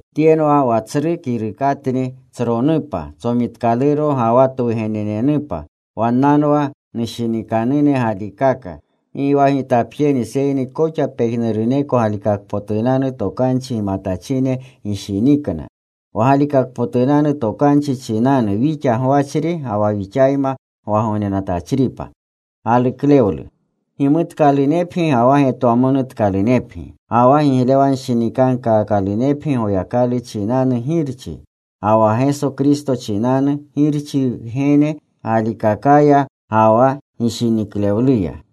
Tyenwa wa tsru kirukatni. Tsronupa, tsomitkaluro ga wa twugenenenupa. Wannanwa nushinikanune galikaka. Gi wa gitapjeni seyni koxa pejnuruneko galikakpotunanu tokanchi gimatachine gishinikna, wa galikakpotunanu tokanchi chinanu, wixa gwachri ga wa wixayma gwagognenatachripa. Gimutkalunepgi ga wa getwamonutkalunepgi, ga wa giglewanshinikankaakalunepgi Goyakalu chinanu Girchi, ga wa Geso Kristo chinanu Girchi Wgene galikakaya ga wa gishiniklewluya.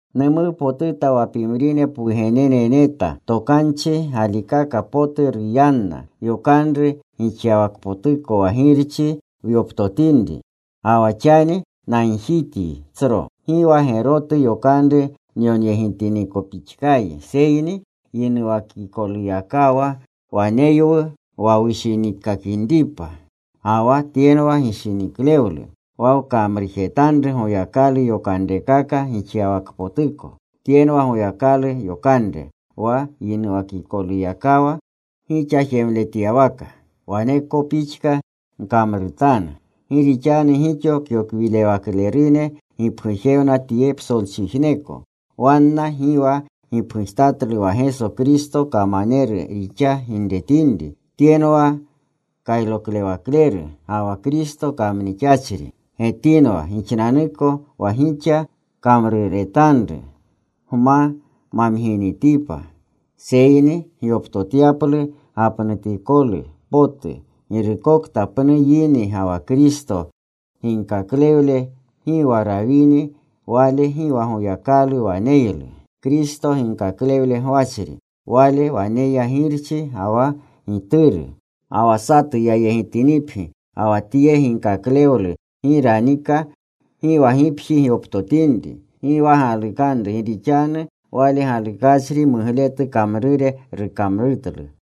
Numuwpotuta wa pimrine pwugenene neta, tokanchi galikaka potu ruyanna, yokanru gixyawakpotuko wa Girchi wyoptotinri. Ga wa xani nagjityi, tsro. Gi wa gerotu yokanru nyonyegitinikopixkayi, seyni yinuwakikoluyakawa waneywu, wa wushiniikakinripa. Ga wa tyenwa gishiniklewlu, wa wkamrujetanru Goyakalu yokanrekaka gixyawakpotuko. Tyenwa Goyakalu yokanre wa yinuwakikoluyakawa gixa jemletyawaka. Waneko pixka gkamrutanu. Gi rixanu gixo kyokwirewaklerune gipgujewna tye psolchijneko. Wanna gi wa gipgujtatlu wa Geso Kristo kamaneru rixa ginretinri. Tyenwa kyokwirewakleru ga wa Kristo kamnixachri. Getinwa gixnanuko wa gixa kamruretanru gma mamginitipa, seyni gyoptotyaplu gapnutikolu potu. Girukokta pnu yini ga wa Kristo ginaklewle gi wa rawini, wale gi wa Goyakalu waneylu. Kristo ginkaklewle gwachri, wale waneya Girchi ga wa Gituru. Ga wa satu yayegitinipgi ga wa tye ginkaklewlu gi ranika, gi wa gipji gyoptotinri. Gi wa galukanru. Gi rixanu wale galukachri mugletu kamrure rukamrutlu.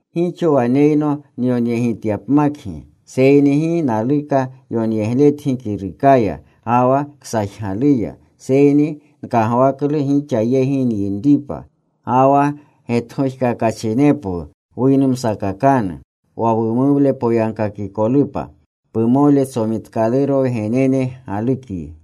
Gixo waneyno nyonyegityapmakgi, seyni gi naluka yonyegletgi kirukaya ga wa ksajgaluya. Seyni nkagwaklu gixa yegi nyinripa, ga wa getgojkakachinepwu wuynumsakakanu, wa wumuwle poyagkakikolupa. Pumole tsomitkaluro wgenene galukyi.